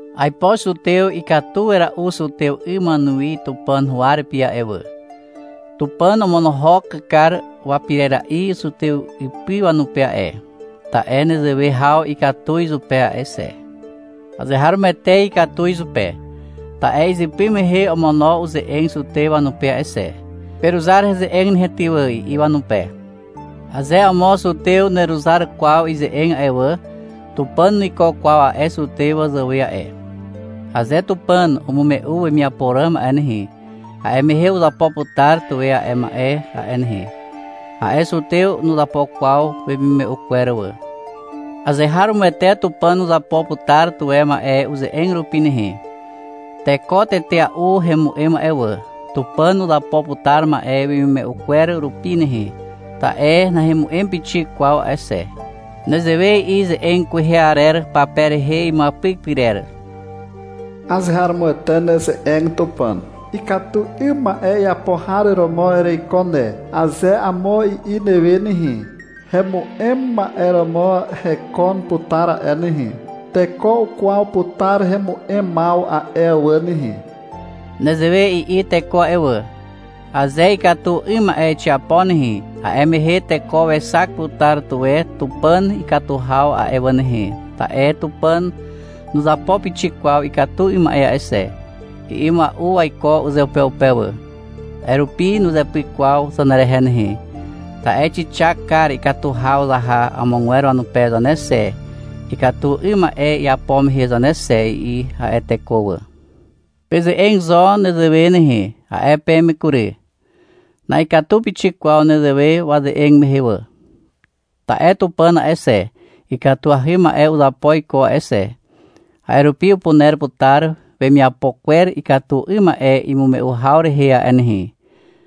Aipo zutew ikatu wera'u zutew 'ygwer wanuwi Tupàn huwa rupi a'e wà. Tupàn omonohok kar wapirera'i zutew ipy wanupe a'e, ta'e nezewe haw ikatu izupe a'e xe. Azeharomoete ikatu izupe. Ta'e izypy mehe omono uze'eg zutew wanupe a'e xe. — Peruzar heze'eg nehe ty wà, i'i wanupe. Aze amo zutew nuweruzar kwaw ize'eg a'e wà, Tupàn nuiko kwaw a'e zutew wazàwe a'e. Aze Tupàn umume'u wemiapo ràm a'e nehe, a'e mehe uzapo putar tuwe a'e ma'e a'e nehe. A'e zutew nuzapo kwaw wemimume'u kwer wà. Azeharomoete Tupàn uzapo putar tuwe ma'e uze'eg rupi nehe. Teko tetea'u hemu'em a'e wà. Tupàn uzapo putar ma'e wemimume'u kwer rupi nehe, ta'e nahemu'em pixik kwaw a'e xe. Nezewe i'i ze'eg kwehe arer pape rehe imuapyk pyrer. — Azeharomoete neze'eg, Tupàn. — Ikatu 'ym ma'e iapo har romo ereiko ne, aze amo i'i newe nehe, hemu'em ma'e romo hekon putar a'e nehe. Teko ukwaw putar hemu'emaw a'e wà nehe. Nezewe i'i teko a'e wà. — Aze ikatu 'ym ma'e xiapo nehe, a'e mehe teko wexak putar tuwe Tupàn ikatu haw a'e wà nehe, ta'e Tupàn nuzapo pixik kwaw ikatu 'ym ma'e a'e xe, i'i mua'u waiko uzeupeupe wà. — A'e rupi, nuzepyk kwaw zanerehe nehe, ta'e xixak kar ikatu haw zaha amogwer wanupe zane xe, ikatu 'ym ma'e iapo mehe zane xe, i'i a'e teko wà. Peze'eg zo nezewe nehe, a'e peme kury. Na'ikatu pixik kwaw nezewe waze'eg mehe wà. Ta'e Tupàn a'e xe, ikatuahy ma'e uzapo iko a'e xe. A'e rupi upuner putar wanemiapo kwer ikatu 'ym ma'e imume'u haw rehe a'e nehe,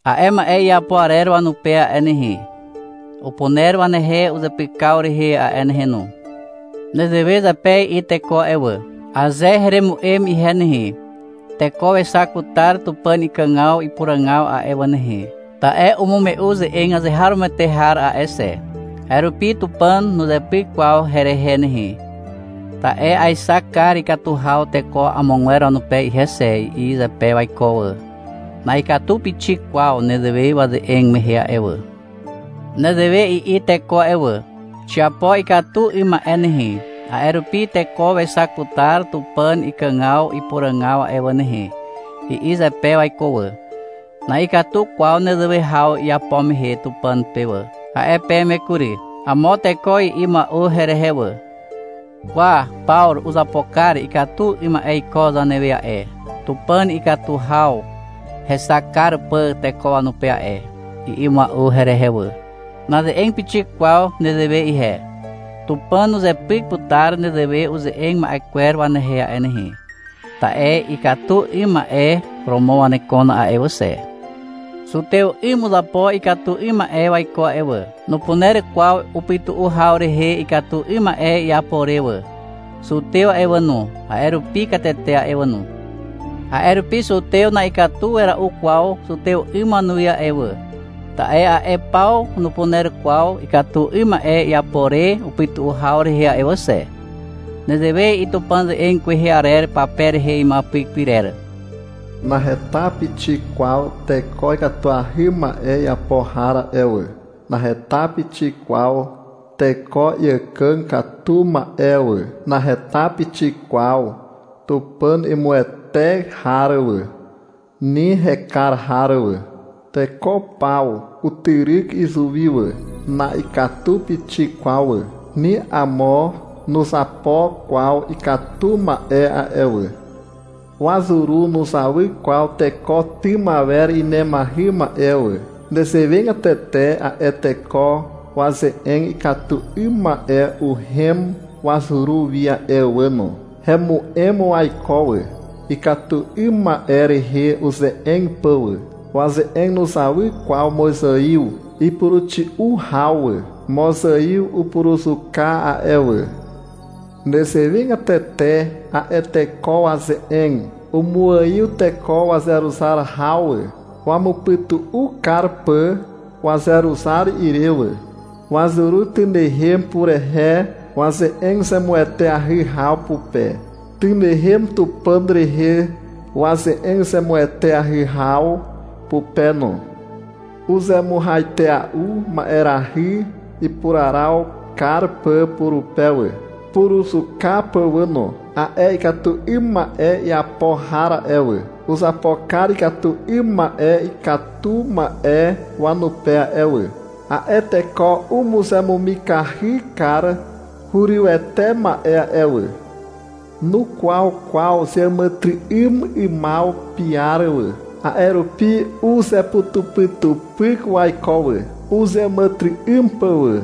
a'e ma'e iapo arer wanupe a'e nehe. Upuner wanehe uzepykaw rehe a'e nehe no. Nezewe zepe i'i teko a'e wà. — Aze heremu'em ihe nehe, teko wexak putar Tupàn ikàgaw ipuràgaw a'e wà nehe, ta'e umume'u ze'eg azeharomoete har a'e xe. A'e rupi Tupàn nuzepyk kwaw herehe nehe, ta'e aexak kar ikatu haw teko amogwer wanupe ihe xe, i'i zepe waiko wà. Na'ikatu pixik kwaw nezewe waze'eg mehe a'e wà. Nezewe i'i teko a'e wà. — Xiapo ikatu 'ym ma'e nehe, a'e rupi teko wexak putar Tupàn ikàgaw ipuràgaw a'e wà nehe, i'i zepe waiko wà. — Na'ikatu kwaw nezewe haw iapo mehe Tupàn pe wà, a'e peme kury. Amo teko i'i mua'u herehe wà. — Kwa, Pawru uzapo kar ikatu 'ym ma'e iko zanewe a'e, Tupàn ikatu haw hexak kar pà teko wanupe a'e, i'i mua'u herehe wà. Naze'eg pixik kwaw nezewe ihe. Tupàn uzepyk putar nezewe uze'eg ma'e kwer wanehe a'e nehe. Ta'e ikatu 'ym ma'e romo wanekon a'e wà xe. Zutew 'ym uzapo ikatu 'ym ma'e waiko a'e wà. Nupuner kwaw upytu'u haw rehe ikatu 'ym ma'e iapo re wà. Zutew a'e wà no, a'e rupi katete a'e wà no. A'e rupi zutew na'ikatu wera'u kwaw zutew 'ym wanuwi wà, ta'e a'e paw nupuner kwaw ikatu 'ym ma'e iapo re upytu'u haw rehe a'e wà xe. Nezewe i'i Tupàn ze'eg kwehe arer pape rehe imuapyk pyrer. — Naheta pixik kwaw teko ikatuahy ma'e iapo har a'e wà. Naheta pixik kwaw teko iàkàg katu ma'e wà. Naheta pixik kwaw Tupàn imuwete har wà, ni hekar har wà. Teko paw utyryk izuwi wà. Na'ikatu pixik kwaw wà. Ni amo nuzapo kwaw ikatu ma'e a'e wà. Wazuru nuzawy kwaw teko tym awer inemahy ma'e wà. Nezewegatete a'e teko waze'eg ikatu 'ym ma'e uhem wazuru wi a'e wà no. Hemu'em waiko wà, ikatu 'ym ma'e rehe uze'eg pà wà. Waze'eg nuzawy kwaw mozaiw ipuruxi'u haw wà. Mozaiw upuruzuka a'e wà. Nezewegatete a'e teko waze'eg umuaiw teko wazeruzar haw wà, wamupytu'u kar pà wazeruzar ire wà. Wazuru tynehem purehe waze'eg zemueteahy haw pupe, tynehem Tupàn rehe waze'eg zemueteahy haw pupe no. Uzemuhaitea'u ma'erahy ipuraraw kar pà purupe wà, puruzuka pà wà no. A'e ikatu 'ym ma'e iapo har a'e wà, uzapo kar ikatu 'ym ma'e ikatu ma'e wanupe a'e wà. A'e teko umuzemumikahy kar hurywete ma'e a'e wà. Nukwaw kwaw zeàmàtyry'ym 'ymaw piar wà. A'e rupi uzeputupytupyk waiko wà, uzeàmàtyry'ym pà wà.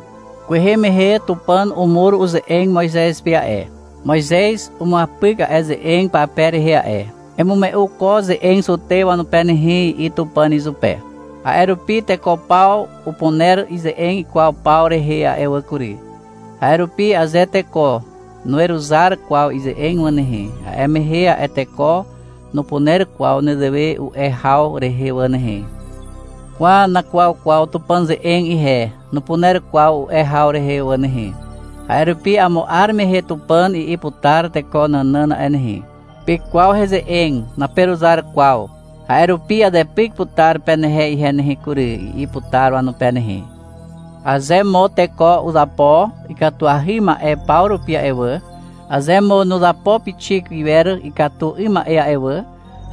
Kwehe mehe Tupàn umur uze'eg Moizez pe a'e. Moizez umuapyk a'e ze'eg pape rehe a'e. — Emume'u ko ze'eg zutew wanupe nehe, i'i Tupàn izupe. A'e rupi teko paw upuner ize'eg ikwaw paw rehe a'e wà kury. A'e rupi aze teko nuweruzar kwaw ize'eg wà nehe, a'e mehe a'e teko nupuner kwaw nezewe u'e haw rehe wà nehe. — Kwa, nakwaw kwaw Tupàn ze'eg ihe, nupuner kwaw u'e haw rehe wà nehe. A'e rupi amo 'ar mehe Tupàn i'i putar teko nànàn a'e nehe. — Pekwaw heze'eg, naperuzar kwaw, a'e rupi azepyk putar penehe ihe nehe kury, i'i putar wanupe nehe. Aze mo teko uzapo ikatuahy ma'e paw rupi a'e wà, aze mo nuzapo pixik iwer ikatu 'ym ma'e a'e wà,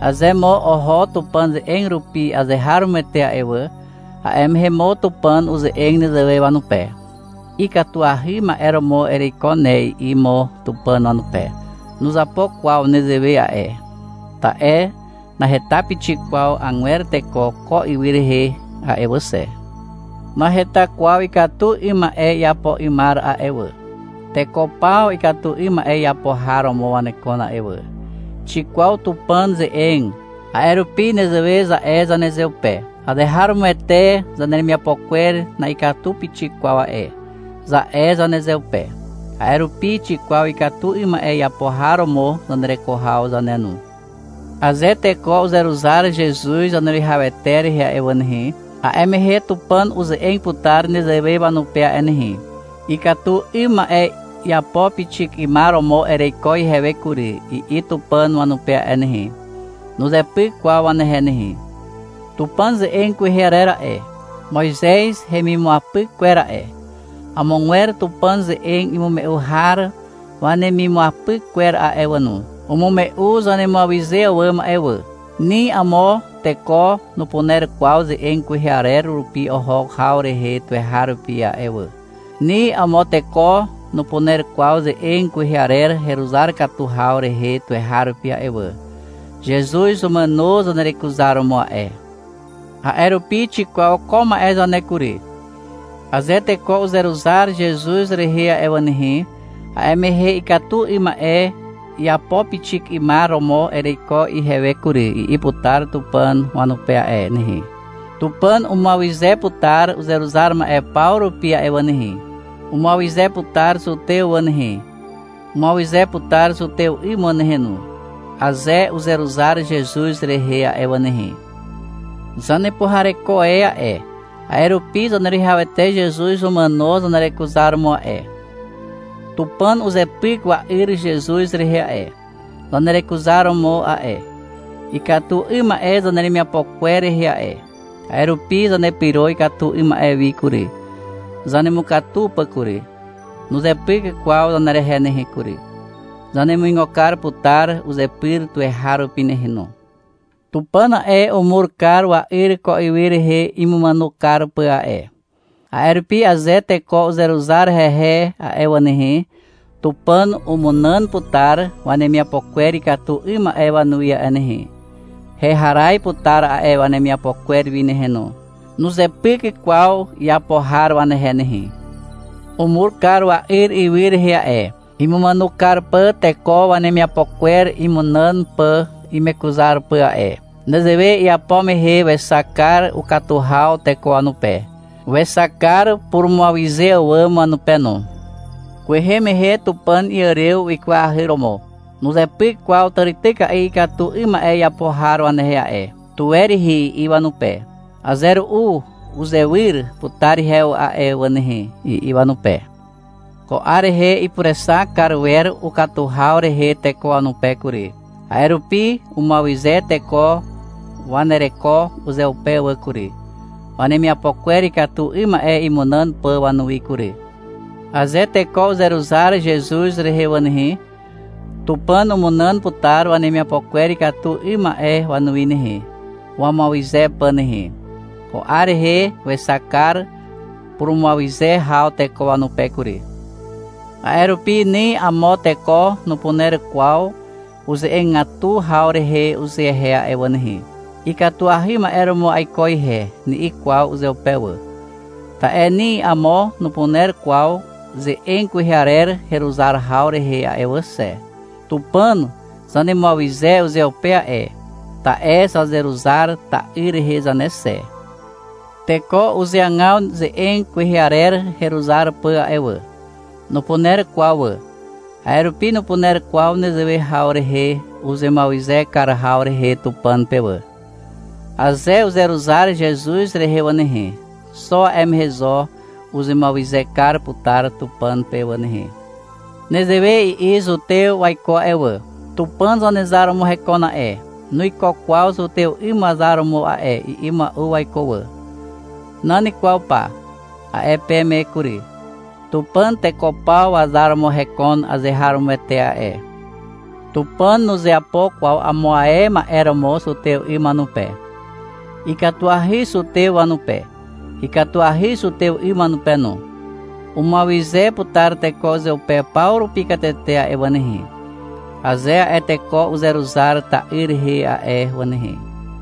aze mo oho Tupàn ze'eg rupi azeharomoete a'e wà, a'e mehe mo Tupàn uze'eg nezewe wanupe. — Ikatuahy ma'e romo ereiko ne, i'i mo Tupàn wanupe. (Nuzapo kwaw nezewe a'e. Ta'e naheta pixik kwaw agwer teko ko ywy rehe a'e wà xe. Naheta kwaw ikatu 'ym ma'e iapo 'ymar a'e wà. Teko paw ikatu 'ym ma'e iapo har romo wanekon a'e wà.) Xikwaw Tupàn ze'eg, a'e rupi nezewe za'e zanezeupe. — Azeharomoete zaneremiapo kwer na'ikatu pixik kwaw a'e, za'e zanezeupe. A'e rupi xikwaw ikatu 'ym ma'e iapo har romo zanereko haw zane no. Aze teko uzeruzar Zezuz Zaneruwihawete rehe a'e wà nehe, a'e mehe Tupàn uze'eg putar nezewe wanupe a'e nehe. — Ikatu 'ym ma'e iapo pixik 'ymar romo ereiko ihewe kury, i'i Tupàn wanupe a'e nehe. Nuzepyk kwaw wanehe nehe. Tupàn ze'eg kwehe arer a'e, Moizez hemimuapyk kwer a'e, amogwer Tupàn ze'eg imume'u har wanemimuapyk kwer a'e wà no, umume'u zanemuawyze àwàm a'e wà. Ni amo teko nupuner kwaw ze'eg kwehe arer rupi oho haw rehe tuweharupi a'e wà. Ni amo teko nupuner kwaw ze'eg kwehe arer heruzar katu haw rehe tuweharupi a'e wà. Zezuz umàno zanerekuzaromo a'e. A'e rupi xikwaw ko ma'e zane kury. Aze teko uzeruzar Zezuz rehe a'e wà nehe, a'e mehe — Ikatu 'ym ma'e iapo pixik 'ymar romo ereiko ihewe kury, i'i putar Tupàn wanupe a'e nehe. Tupàn umuawyze putar uzeruzar ma'e paw rupi a'e wà nehe. Umuawyze putar zutew wà nehe. Umuawyze putar zutew 'ym wà nehe no, aze uzeruzar Zezuz rehe a'e wà nehe. Zanepuhareko e a'e, a'e rupi Zaneruwihawete Zezuz umàno zanerekuzaromo a'e. Tupàn uzepyk wa'yr Zezuz rehe a'e, zanerekuzaromo a'e, ikatu 'ym ma'e zaneremiapo kwer rehe a'e. A'e rupi zanepyro ikatu 'ym ma'e wi kury, zanemukatu pà kury. Nuzepyk kwaw zanerehe nehe kury. Zanemuigo kar putar uzepyr tuweharupi nehe no. Tupàn a'e, umur kar wa'yr ko ywy rehe imumàno kar pà a'e. A'e rupi aze teko uzeruzar hehe a'e wà nehe, Tupàn umunàn putar wanemiapo kwer ikatu 'ym ma'e wanuwi a'e nehe. Heharaz putar a'e wanemiapo kwer wi nehe no. Nuzepyk kwaw iapo har wanehe nehe. Umur kar wa'yr ywy rehe a'e, imumàno kar pà teko wanemiapo kwer imunàn pà imekuzar pà a'e. Nezewe iapo mehe wexak kar ukatu haw teko wanupe. Wexak kar purumuawyze àwàm wanupe no. Kwehe mehe Tupàn iàrew wikwahy romo. Nuzepyk kwaw tàrityka'i ikatu 'ym ma'e iapo har wanehe a'e. — Tuwe rihi, i'i wanupe. — Aze ru'u uzewyr putar ihewe a'e wà nehe, i'i wanupe. Ko 'ar rehe ipurexak kar wer ukatu haw rehe teko wanupe kury. A'e rupi umuawyze teko wanereko uzeupe wà kury, wanemiapo kwer ikatu 'ym ma'e imunàn pà wanuwi kury. Aze teko uzeruzar Zezuz rehe wà nehe, Tupàn umunàn putar wanemiapo kwer ikatu 'ym ma'e wanuwi nehe, wamuawyze pà nehe. Ko 'ar rehe wexak kar purumuawyze haw teko wanupe kury. A'e rupi ni amo teko nupuner kwaw uze'egatu haw rehe uzehe a'e wà nehe. — Ikatuahy ma'e romo aiko ihe, ni'i kwaw uzeupe wà. Ta'e ni amo nupuner kwaw ze'eg kwehe arer heruzar haw rehe a'e wà xe. Tupàn zanemuawyze uzeupe a'e, ta'e zazeruzar ta'yr rehe zane xe. Teko uzeagaw ze'eg kwehe arer heruzar pà a'e wà. Nupuner kwaw wà, a'e rupi nupuner kwaw nezewe haw rehe uzemuawyze kar haw rehe Tupàn pe wà. Aze uzeruzar Zezuz rehe wà nehe, xo a'e mehe zo uzemuawyze kar putar Tupàn pe wà nehe. Nezewe i'i zutew waiko a'e wà. — Tupàn Zanezar romo hekon a'e, nuiko kwaw zutew 'ym wazar romo a'e, i'i mua'u waiko wà. — Nan kwaw pa, a'e peme kury. Tupàn teko paw wazar romo hekon azeharomoete a'e. Tupàn nuzeapo kwaw amo ae ma'e romo zutew 'ym wanupe. Ikatuahy zutew wanupe, ikatuahy zutew 'ym wanupe no. Umuawyze putar teko uzeupe paw rupi katete a'e wà nehe, aze a'e teko uzeruzar ta'yr rehe a'e wà nehe.